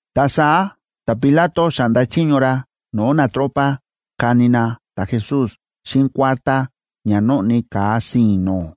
Ta saá ta̱Pilato xa̱ꞌnda chiño ra no̱o̱ natropa kani na ta̱Jesús xíꞌin kuártá ña nóꞌni ka̱a si̱i̱n no̱o̱.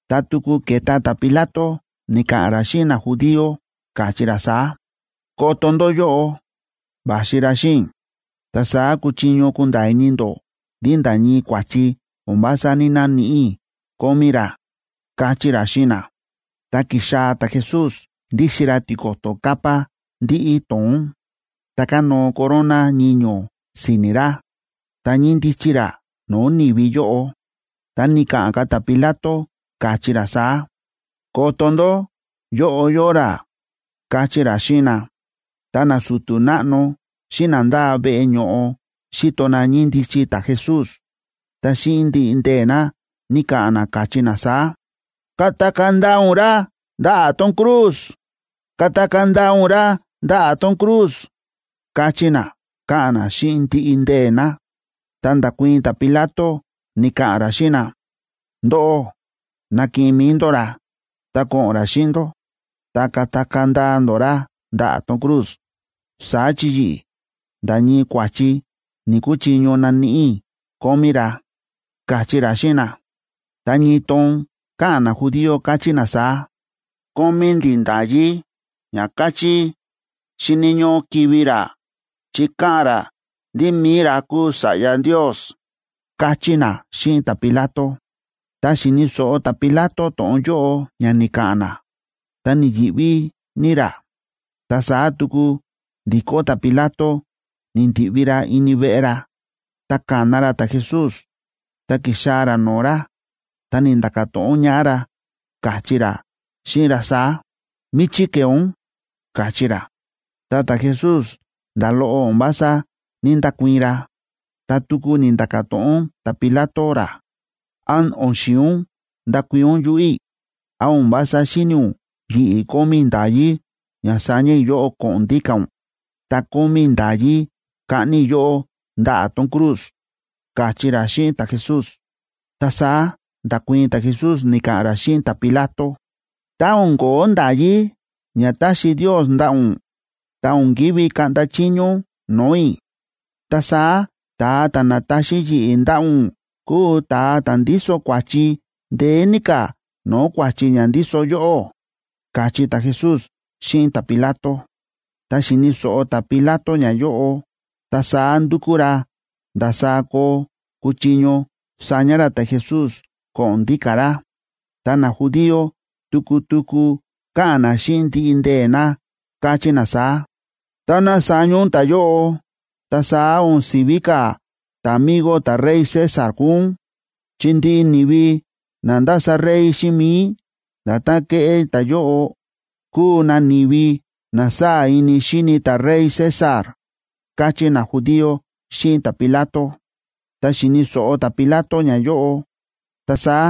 Ta tuku ke̱ta ta̱Pilato ni̱ka̱ꞌa̱n ra xíꞌin najudío, káchí ra saá: ―Koto ndó yóꞌo, va̱xi ra xíꞌin i̱. Ta saá kuchiño kunda̱a̱ ini ndó ndí nda̱ ñii kua̱chi o̱n vása ní‑naníꞌi i̱ kómí ra ―káchí ra xíꞌin na. Ta ki̱xaa̱ ta̱Jesús ndíxin ra tiko̱to̱ capa ndíꞌí to̱ón, ta kánóo corona ñiño̱ si̱ni̱ ra, ta ñíndichi ra no̱o̱ ni̱vi yóꞌo. Ta ni̱ka̱ꞌa̱n ka̱ ta̱Pilato, káchí ra saá: ―Koto ndó, yóꞌo yóo ra ―káchí ra xíꞌin na. Tá nasu̱tu̱ náꞌno xíꞌin na ndáa veꞌe ño̱ꞌo xi̱to na ñíndichi ta̱Jesús, ta xíꞌin ndiꞌi ndee̱ na, ni̱ka̱ꞌa̱n na, káchí na saá: ―¡Katakaa̱ ndaa ún ra ndaꞌa̱ tón cruz! ¡Katakaa̱ ndaa ún ra ndaꞌa̱ tón cruz! ―káchí na, káꞌa̱n na xíꞌin ndiꞌi ndee̱ na. Ta nda̱kuii̱n ta̱Pilato, ni̱ka̱ꞌa̱n ra xíꞌin na: ―Ndóꞌó, ná kiꞌin mi̱i ndó ra, ta ná ko̱ꞌo̱n ra xíꞌin ndó, ta katakaa̱ ndaa ndó ra ndaꞌa̱ tón cruz. Saá chi yi̱ꞌi̱, nda̱ ñii kua̱chi ni̱‑kuchiño naníꞌi i̱ kómí ra ―káchí ra xíꞌin na. Ta ñii toon káꞌa̱n najudío, káchí na saá: ―Kómí ndi̱ nda̱yí ña káchí xíni̱ ñóꞌó kivi̱ ra, chi káꞌa̱n ra ndí mi̱i ra kúu Sa̱ꞌya Ndios ―káchí na xíꞌin ta̱Pilato. Tá xi̱ni̱ so̱ꞌo ta̱Pilato to̱ꞌon yóꞌo ña ni̱ka̱ꞌa̱n na, ta ni̱yi̱ꞌví ní ra. Ta saá tuku ndi̱kó ta̱Pilato ni̱ndi̱ꞌvi ra ini veꞌe ra, ta ka̱na ra ta̱Jesús ta ki̱xaa̱ ra no̱o̱ ra, ta ni̱nda̱ka̱ to̱ꞌon ñaꞌá ra, káchí ra xíꞌin ra saá: ―¿Míchí ke̱e ún? ―káchí ra. Ta ta̱Jesús, nda̱ loꞌo o̱n vása ní‑ndakuii̱n ra. Ta tuku ni̱nda̱ka̱ to̱ꞌon ta̱Pilato ra: ―¿Án o̱n xi̱in ún ndakuii̱n ún yuꞌu̱ i̱? ¿Án o̱n vása xíni̱ ún yi̱ꞌi̱ kómí i̱ nda̱yí ña saña i̱ yóꞌó ko̱ꞌo̱n ndíka̱ ún, ta kómí i̱ nda̱yí kaꞌni i̱ yóꞌó ndaꞌa̱ tón cruz? ―káchí ra xíꞌin ta̱Jesús. Ta saá nda̱kuii̱n ta̱Jesús ni̱ka̱ꞌa̱n ra xíꞌin ta̱Pilato: ―Tá o̱n ko̱ó nda̱yí ña ta̱xi Ndios ndaꞌa̱ ún, ta o̱n ki̱ví kaꞌnda chiño ún no̱o̱ i̱. Ta saá ta̱a ta̱ na̱taxi yi̱ꞌi̱ ndaꞌa̱ ún kúu ta̱a ta̱ ndíso kua̱chi ndeé ní ka̱ no̱o̱ kua̱chi ña ndíso yóꞌó ―káchí ta̱Jesús xíꞌin ta̱Pilato. Tá xi̱ni̱ so̱ꞌo ta̱Pilato ñayóꞌo, ta saá ndu̱kú ra ndasaá koo kuchiño saña ra ta̱Jesús ko̱ꞌo̱n ndíka̱ ra. Ta najudío tuku tuku káꞌa̱n na xíꞌin ndiꞌi ndee̱ na, káchí na saá: ―Táná saña ún ta̱yóꞌo, ta saá o̱n si̱ví ka̱ ta̱migo ta̱rey César kúu ún, chi ndiꞌi ni̱vi na ndása rey xíꞌin mi̱i, nda̱tán ke̱ꞌé ta̱yóꞌo, kúu na ni̱vi na sáa̱ ini xíni ta̱rey César ―káchí najudío xíꞌin ta̱Pilato. Tá xi̱ni̱ so̱ꞌo ta̱Pilato ñayóꞌo, ta saá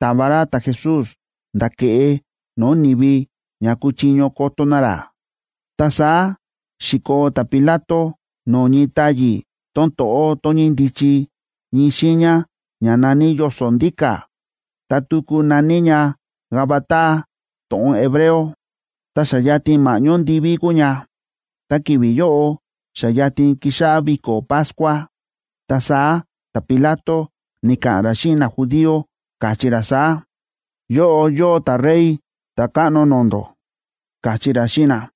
ta̱va ra ta̱Jesús nda̱ ke̱ꞌe no̱o̱ ni̱vi ña kuchiño koto na ra. Ta saá xi̱koo ta̱Pilato no̱o̱ ñii táyi̱ tón to̱ꞌó, tón ñíndichi ñii xiiña ña na̱ní Yoso̱ Ndíka̱,a ta tuku na̱ní ña Gabata to̱ꞌon hebreo. Ta xa yatin ma̱ꞌñó ndivíb kúu ña, ta ki̱vi̱ yóꞌo xa yatin kixáꞌá viko̱ Pascua. Ta saá ta̱Pilato ni̱ka̱ꞌa̱n ra xíꞌin najudío, káchí ra saá: ―Yóꞌo yóo ta̱Rey ta̱káꞌno no̱o̱ ndó ―káchí ra xíꞌin na.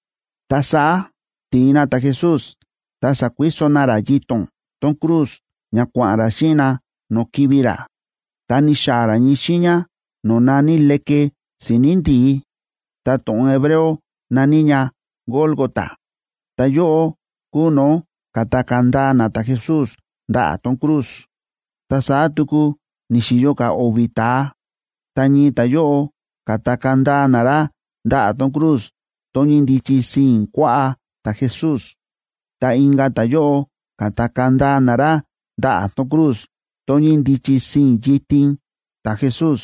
Ta saá ti̱in na ta̱Jesús, ta sa̱kuiso na ra yito̱n tón cruz ña kua̱ꞌa̱n ra xíꞌin na no̱o̱ kivi̱ ra. Ta ni̱xaa̱ ra ñii xiiña no̱o̱ na̱ní Leke Si̱ni̱ Ndi̱í, ta to̱ꞌon hebreo na̱ní ña Gólgota. Ta yóꞌo kúu no̱o̱ ka̱takaa̱ ndaa na ta̱Jesús ndaꞌa̱ tón cruz. Ta saá tuku ni̱xi̱yo ka̱ o̱vi̱ ta̱a, ta ñii ta̱yóꞌo, ka̱takaa̱ ndaa na ra ndaꞌa̱ tón cruz tón ñíndichi sii̱n kuaꞌá ta̱Jesús, ta inka̱ ta̱yóꞌo ka̱takaa̱ ndaa na ra ndaꞌa̱ tón cruz tón ñíndichi sii̱n yitin ta̱Jesús.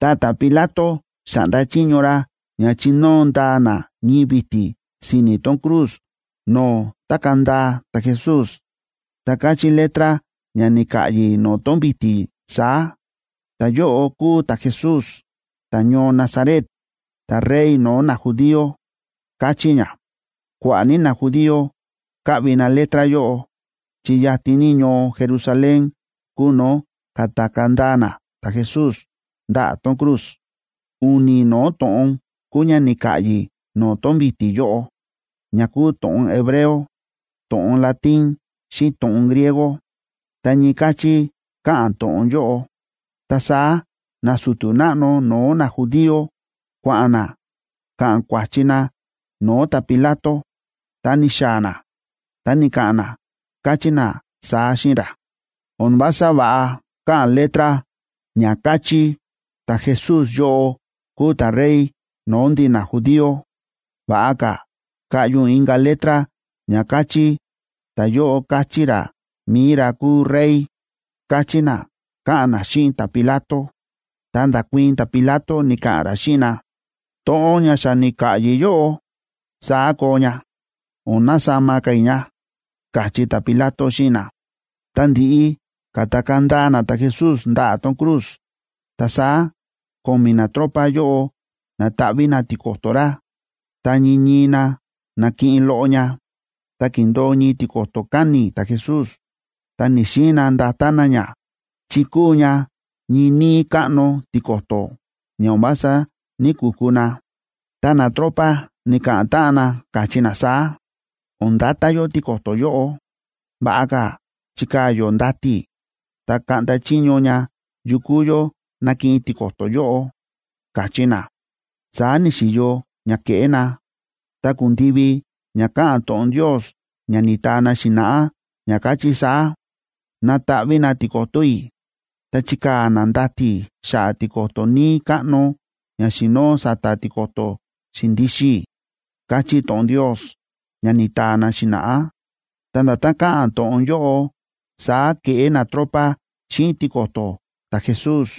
Ta ta̱Pilato xa̱ꞌnda chiño ra ña chinóo ndaa na ñii vi̱ti̱ si̱ni̱ tón cruz no̱o̱ tákaa̱ ndaa ta̱Jesús. Ta káchí letra ña ni̱ka̱ꞌyi̱ no̱o̱ tón vi̱ti̱ saá: “Ta̱yóꞌo kúu ta̱Jesús, ta̱ñoo Nazaret, ta̱Rey no̱o̱ najudío”, káchí ña. Kua̱ꞌa̱ ní najudío káꞌvi na letra yóꞌo, chi yatin ní ñoo Jerusalén kúu no̱o̱ ka̱takaa̱ ndaa na ta̱Jesús ndaꞌa̱ tón cruz. U̱ni̱ no̱o̱ to̱ꞌon kúu ña ni̱ka̱ꞌyi̱ no̱o̱ tón vi̱ti̱ yóꞌo, ña kúu to̱ꞌon hebreo, to̱ꞌon latín, xíꞌin to̱ꞌon griego, ta ñii káchí káꞌa̱n to̱ꞌon yóꞌo. Ta saá nasu̱tu̱ náꞌno no̱o̱ najudío kua̱ꞌa̱n na ka̱ꞌa̱n kua̱chi na no̱o̱ ta̱Pilato. Tá ni̱xaa̱ na, ta ni̱ka̱ꞌa̱n na, káchí na saá xíꞌin ra: ―O̱n vása va̱ꞌa káꞌa̱n letra ña káchí ta̱Jesús yóꞌo kúu ta̱Rey no̱o̱ ndi̱ najudío. Va̱ꞌa ka̱ kaꞌyi ún inka̱ letra ña kachí: “Ta̱yóꞌo káchí ra mi̱i ra kúu Rey” ―káchí na, káꞌa̱n na xíꞌin ta̱Pilato. Ta nda̱kuii̱n ta̱Pilato ni̱ka̱ꞌa̱n ra xíꞌin na: ―To̱ꞌon ña xa ni̱ka̱ꞌyi̱ yóꞌo, saá koo ña, o̱n nasama ka̱ i̱ ña ―káchí ta̱Pilato xíꞌin na. Tá ndi̱ꞌi ka̱takaa̱ ndaa na ta̱Jesús ndaꞌa̱ tón cruz, ta saá ko̱mi̱ natropa yóꞌo na̱taꞌví na tiko̱to̱ ra, ta ñii ñii na na̱kiꞌin loꞌo ña. Ta ki̱ndo̱o ñii tiko̱to̱ káni̱ ta̱Jesús, ta ni̱‑xiin na ndata na ña, chi kúu ña ñii níí káꞌno tiko̱to̱, ña o̱n vása ní‑kuku na. Ta natropa ni̱ka̱ꞌa̱n táꞌan na, káchí na saá: ―O̱n ndata yó tiko̱to̱ yóꞌo. Va̱ꞌa ka̱ chikaa̱ yó ndati̱, ta kaꞌnda chiño ña yukú yó nakiꞌin tiko̱to̱ yóꞌo ―káchí na. Saá ni̱xi̱yo ña ke̱ꞌé na, ta ku̱ndivi ña káꞌa̱n to̱ꞌon Ndios, ña ni̱taa na xi̱na̱ꞌá, ña káchí saá: “Nataꞌví na tiko̱to̱ i̱, ta chikaa̱ na ndati̱ xa̱ꞌa̱ tiko̱to̱ níí káꞌno ña xi̱noo sa̱ta̱ tiko̱to̱ xi̱ndixin i̱”, káchí to̱ꞌon Ndios, ña ni̱taa na xi̱na̱ꞌá, ta nda̱tán káꞌa̱n to̱ꞌon yóꞌo saá ke̱ꞌé natropa xíꞌin tiko̱to̱ ta̱Jesús.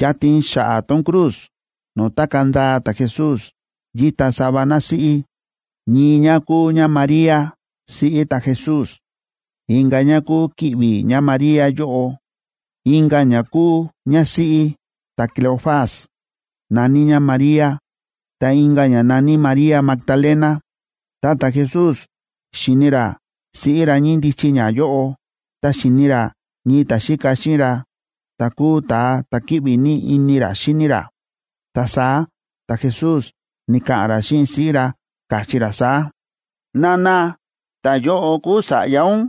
Yatin xa̱ꞌa̱ tón cruz no̱o̱ tákaa̱ ndaa ta̱Jesús, yíta sava násíꞌí. Ñii ñá kúu ñáMaría, siꞌí ta̱Jesús, inka̱ ñá kúu ki̱ꞌvi̱ ñáMaría yóꞌo, inka̱ ñá kúu ñásíꞌí ta̱Cleofas, na̱ní ñá María, ta inka̱ ñá na̱ní María Magdalena. Tá ta̱Jesús xi̱ni ra siꞌí ra ñíndichi ñá yóꞌo ta xi̱ni ra ñii ta̱xíka xíꞌin ra, ta̱ kúu ta̱a ta̱ kíꞌvi ní ini ra xíni ra. Ta saá ta̱Jesús ni̱ka̱ꞌa̱n ra xíꞌin siꞌí ra, káchí ra saá: ―Nana, ta̱yóꞌo kuu sa̱ꞌya ún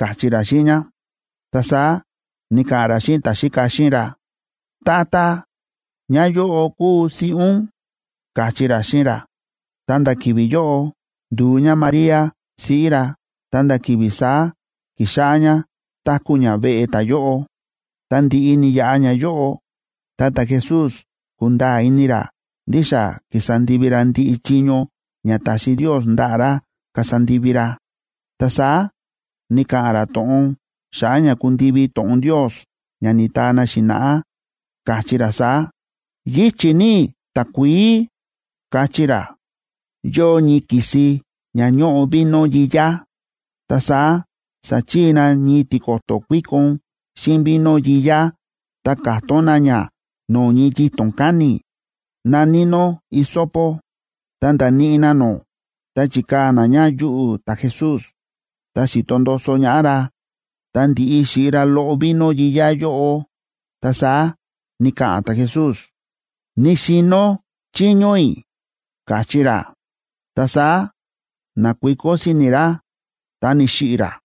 ―káchí ra xíꞌin ñá. Ta saá ni̱ka̱ꞌa̱n ra xíꞌin ta̱xíka xíꞌin ra: ―Tata, ñáyóꞌo kuu siꞌí ún ―káchí ra xíꞌin ra. Ta nda̱ ki̱vi̱ yóꞌo ndu̱u ñáMaría siꞌí ra, ta nda̱ ki̱vi̱ saá ki̱xáꞌá ñá táku̱ ñá veꞌe ta̱yóꞌo. Tá ndi̱ꞌi ni̱yaꞌa ñayóꞌo, ta ta̱Jesús kúnda̱a̱ ini ra ndí xa ki̱sa ndivi ra ndiꞌi chiño ña ta̱xi Ndios ndaꞌa̱ ra kasa ndivi ra, ta saá ni̱ka̱ꞌa̱n ra to̱ꞌon xa̱ꞌa̱ ña kundivi to̱ꞌon Ndios ña ni̱taa na xi̱na̱ꞌá, káchí ra saá: ―Yíchi̱ ní i̱ takuií ―káchí ra. Yóo ñii ki̱si ña ñóꞌo vino yiyá, ta saá sa̱chii na ñii tiko̱to̱ kuíkon xíꞌin vino yiyá ta ka̱tón na ña no̱o̱ ñii yito̱n káni̱, na̱ní nó hisopo, ta nda̱níꞌi na nó, ta chi̱kaa̱ na ña yuꞌu̱ ta̱Jesús, ta xi̱to ndoso ñaꞌá ra. Tá ndi̱ꞌi xi̱ꞌi ra loꞌo vino yiyá yóꞌo, ta saá ni̱ka̱ꞌa̱n ta̱Jesús: ―Ni̱xi̱no̱ chiño i̱ ―káchí ra. Ta saá na̱kuiko si̱ni̱ ra ta ni̱xiꞌi̱ ra.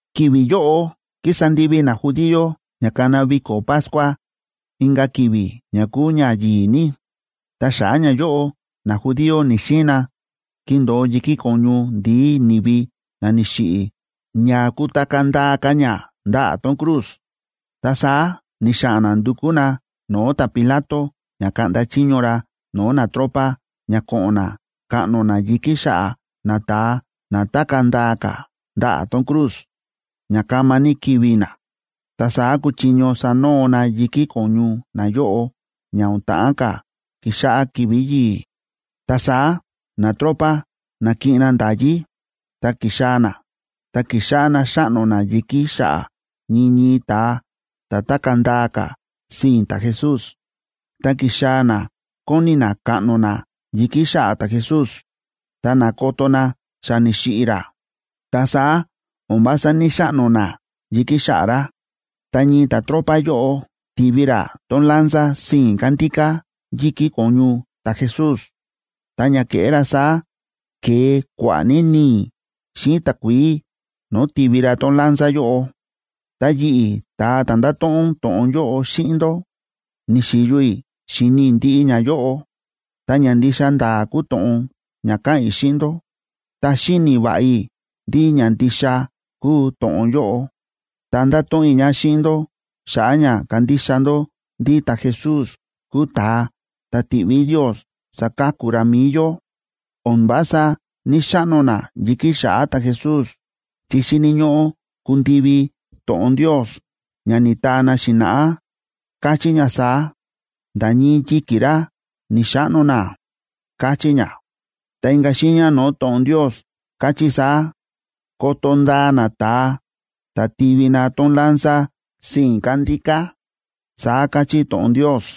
Ki̱vi̱ yóꞌo kísa ndivi najudío ña kana viko̱ Pascua inka̱ ki̱vi̱ ña kúu ña yi̱i̱ ní. Ta xa̱ꞌa̱ ñayóꞌo najudío ni̱‑xiin na kindo̱o yi̱kí ko̱ñu ndi̱í ni̱vi na ni̱xiꞌi̱ ña kutakaa̱ ndaa ka̱ ña ndaꞌa̱ tón cruz. Ta saá ni̱xa̱ꞌa̱n na ndu̱kú na no̱o̱ ta̱Pilato ña kaꞌnda chiño ra no̱o̱ natropa ña ko̱ꞌo̱n na kaꞌno na yi̱kí xa̱ꞌa̱ nata̱a na tákaa̱ ndaa ka̱ ndaꞌa̱ tón cruz, ña kama ní kivi̱ na. Ta saá kuchiño sanoo na yi̱kí ko̱ñu nayóꞌo ña o̱n ta̱ꞌán ka̱ kixáꞌá ki̱vi̱ yi̱i̱. Ta saá natropa na̱kiꞌin na nda̱yí ta ki̱xaa̱ na, ta ki̱xáꞌá na xáꞌno na yi̱kí xa̱ꞌa̱ ñii ñii ta̱a ta̱ tákaa̱ ndaa ka̱ sii̱n ta̱Jesús. Ta ki̱xaa̱ na kóni na kaꞌno na yi̱kí xa̱ꞌa̱ ta̱Jesús, ta na̱koto na xa ni̱xiꞌi̱ ra, ta saá o̱n vása ní‑xaꞌno na yi̱kí xa̱ꞌa̱ ra. Ta ñii ta̱tropa yóꞌo ti̱vi ra tón lanza sii̱n kándíká yi̱kí ko̱ñu ta̱Jesús. Ta ña ke̱ꞌé ra saá, ke̱e kua̱ꞌa̱ ní ni̱i̱ xíꞌin takuií no̱o̱ ti̱vi ra tón lanza yóꞌo. Ta yi̱ꞌi̱, ta̱a ta̱ ndáto̱ꞌon to̱ꞌon yóꞌo xíꞌin ndó, ni̱xi̱yo i̱ xi̱ni i̱ ndiꞌi ñayóꞌo, ta ña ndixa nda̱a̱ kúu to̱ꞌon ña káꞌa̱n i̱ xíꞌin ndó. Ta xíni̱ va̱ꞌa i̱ ndí ña ndixa kúu to̱ꞌon yóꞌo, ta ndáto̱ꞌon i̱ ña xíꞌin ndó xa̱ꞌa̱ ña kandixa ndó ndí ta̱Jesús kúu ta̱a ta̱ ti̱ꞌví Ndios saka̱ku ra mi̱i yó. O̱n vása ní‑xaꞌno na yi̱kí xa̱ꞌa̱ ta̱Jesús chi xíni̱ ñóꞌó kundivi to̱ꞌon Ndios, ña ni̱taa na xi̱na̱ꞌá, káchí ña saá: “Nda̱ ñii yi̱ki̱ ra, ni̱‑xaꞌno na”, káchí ña. Ta inka̱ xiiña no̱o̱ to̱ꞌon Ndios káchí saá: “Koto ndaa na ta̱a ta̱ ti̱vi na tón lanza sii̱n kándíká”, saá káchí to̱ꞌon Ndios.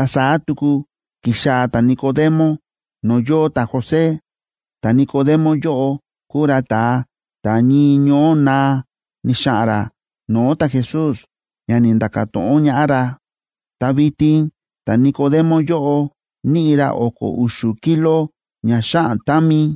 Ta saá tuku ki̱xaa̱ ta̱Nicodemo no̱o̱ yóo ta̱José. Ta̱Nicodemo yóꞌo kúu ra ta̱a ta̱ ñii ñoó naa ni̱xa̱ꞌa̱n ra no̱o̱ ta̱Jesús ña ni̱nda̱ka̱ to̱ꞌon ñaꞌá ra. Ta vitin ta̱Nicodemo yóꞌo níꞌi ra o̱ko̱ u̱xu̱ kilo ña xáꞌan támi,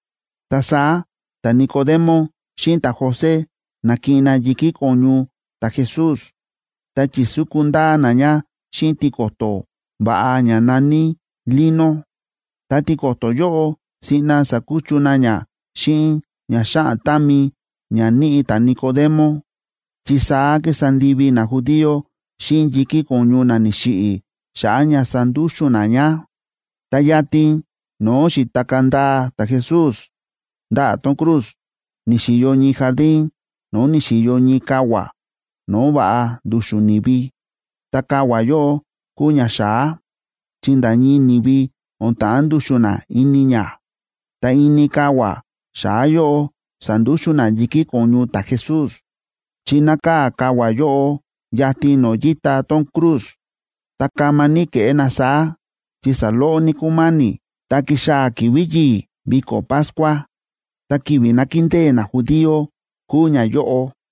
Ta saá ta̱Nicodemo xíꞌin ta̱José na̱kiꞌin na yi̱kí ko̱ñu ta̱Jesús, ta chi̱súku ndaa na ña xíꞌin tiko̱to̱ va̱ꞌa ña na̱ní lino. Ta tiko̱to̱ yóꞌo, siꞌna sa̱kuchu na ña xíꞌin ña xáꞌan támi ña níꞌi ta̱Nicodemo, chi saá kísa ndivi najudío xíꞌin yi̱kí ko̱ñu na ni̱xiꞌi̱ xa̱ꞌa̱ ña sandúxu̱n na ña. Ta yatin no̱o̱ xi̱takaa̱ ndaa ta̱Jesús ndaꞌa̱ tón cruz ni̱xi̱yo ñii jardín no̱o̱ ni̱xi̱yo ñii kavua̱ no̱o̱ va̱ꞌa ndu̱xu̱n ni̱vi. Ta kavua̱ yóꞌo kúu ña xa̱á, chi nda̱ ñii ni̱vi o̱n ta̱ꞌán ndu̱xu̱n na ini ña. Ta ini kavua̱ xa̱á yóꞌo sa̱ndúxu̱n na yi̱kí ko̱ñu ta̱Jesús, chi nákaa̱ kavua̱ yóꞌo yatin no̱o̱ yíta tón cruz. Ta kama ní ke̱ꞌé na saá, chi saloꞌo ní kúma̱ni̱ ta kixáꞌá ki̱vi̱ yi̱i̱ viko̱ Pascua, ta ki̱vi̱ nákindée najudío kúu ñayóꞌo.